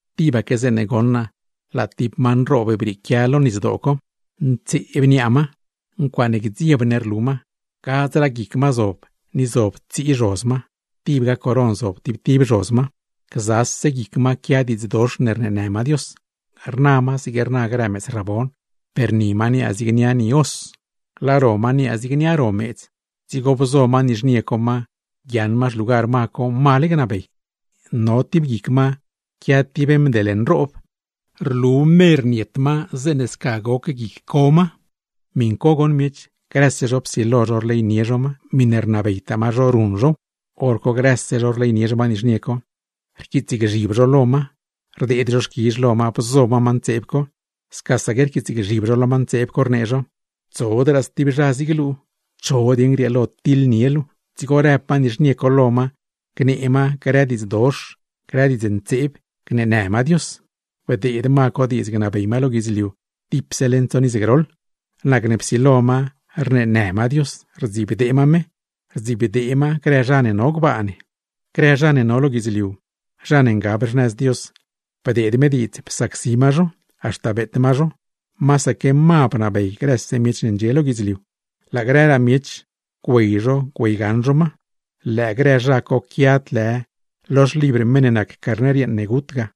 Tibaque zeeṉe goṉ naa laa tib ma nroob brieequia lo nisdoo co, ntseeb niaa ma. Ncuaaṉe gdzieb ne rlu ma, gadzraa guic ma zob ni zob tsii zhoz ma; tibga coron zob tib tib zhoz ma. Gzase guic ma quia diidznë ne rneenë ma Dios. Rna ma zig rna grë meedz rabon, per ni ma niaa zig niaa ni os, laa ro ma niaa zig niaa ro meedz. Dzigo bzo ma nizhnie co ma guiaaṉ ma xlugar ma co, male gnabey. No tib guic ma no tib mdel nroob, rlu mer niet ma zeeṉe sca goc guic co ma. Miṉ co goṉ miech, grëse zho psilo zho rleynie zho ma, miṉe rnabeytaa ma zho, ruṉ zhow. Horco grëse zho rleynie zho ma nizhnie co, rquiitsgzhib zho lo ma, rdeed zho xquizh lo ma bzo ma ma ntseeb co; scasaque rquiitsgzhib zho lo ma ntseeb co, rnee zho: ―¡Tsodraa stib zha zig luu! ¿Cho dieṉ grieelo tiḻnie luu? Dzigo rëb ma nizhnie co lo ma gnee ma grë diidz dox, grë diidznë, gneenë ma Dios; bdeed ma co diidz gnabey ma lo guidzliu dipse leṉ tsoṉ iz groḻ. Nacne psilo ma rneenë ma Dios, rdzibdee ma me, rdzibdee ma grë zha no gbaa ne. Grë zha ne no lo guidzliu, zha ne ngab xnëz Dios, bdeed me diidz psacsi ma zho, haxta beet ma zho; masaque ma bnabey grëse miech ne ndxie lo guidzliu. Laa grëraa miech, güey zho güeygaṉ zho ma, lëë grë zha co quiad lë lo xlibr meṉ ne nac Carner yeeṉ ne gut ga.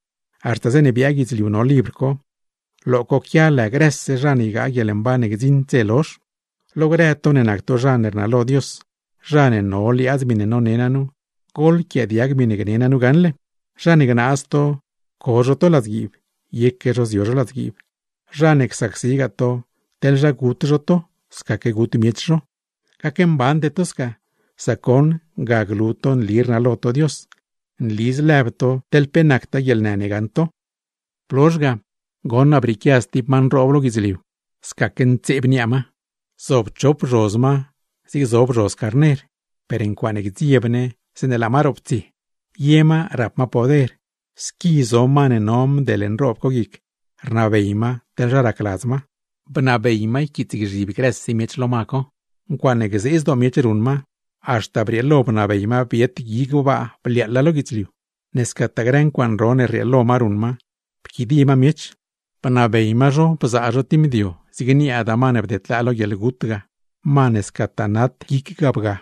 Haxta zeeṉe biaa guidzliu no libr co, lo co quia lë grëse zha ne ygaa guieḻmban ne gdziṉd dze lozh. Lo grë to ne nac to zha ne rnalo Dios, zha ne no liaadz miṉe none naa nu, goḻquiaadiag miṉe gne naa nu gaṉle: Zha ne gnaaz to co zho to ladzguiib, yeque zho zio zho ladzguiib; zha ne csacsigaa to, teḻ zha gut zho to, scaque gut miech zho. Gacmbande to sca, sac goṉ ga glu to nli rnalo to Dios, nli zlëb to teḻ pe nactaa guieḻnë ne gaṉ to. Blozh ga, goṉ naa brieequia stib ma nroob lo guidzliu, scaque ntseeb niaa ma, zob chop zhoz ma zig zob zhoz carner, per ncuaaṉe gdzieb ne zeeṉe laa ma roptsie. Ye ma rap ma poder, squi zo ma ne no mdel nroob co guic rnabey ma teḻ zha racladz ma; bnabey ma yquiitsgzhib grëse miech lo ma co. Ncuaaṉe gzee zdoo miech ruṉ ma, haxta brieelo bnabey ma biet gui gbaa bliaaḻa lo guidzliu. Ne scataa grë ncuaaṉ ro ne rrieelo ma ruṉ ma, pquidie ma miech, bnabey ma zho bzaa zho tib mdio zig niaada ma ne bdedlaa lo guieḻgut ga, ma ne scataa nat guic ga bga.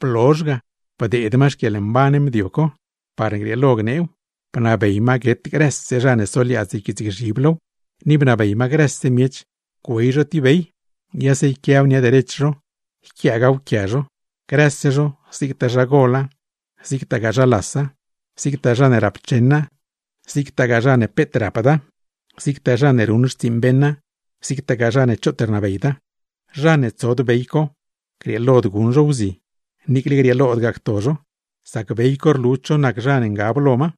Blozh ga, bdeed ma xquieḻmban mdio co, parne grieelo gneew. Bnabey ma guet grëse zha ne soliaadz yquiitsgzhib low, ni bnabey ma grëse miech güey zho tib bey, yase yquiaw nia derech zho, yquiaagaaw quia zho; grëse zho zigtaa zha gola, zigtagaa zha lasa, zigtaa zha ne rapcheṉa, zigtagaa zha ne peet rapda, zigtaa zha ne ruṉ xtsiiṉ beṉa, zigtagaa zha ne choot rnabeyda. Zha ne tsod bey co, grieelod guṉ zho wzi niicle grieelodgaa cto zho; sac bey co rlu cho nac zha ne ngab lo ma,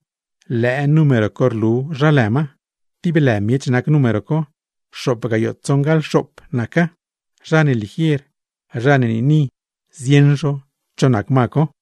lëë lë ma ga, lëë número co rlu zha lë ma. Tib lë miech nac número co; xoop gayoo tsoṉgaḻ xoop naca. Zha ne ligier, zha ne niini, zieṉ zho cho nac ma co.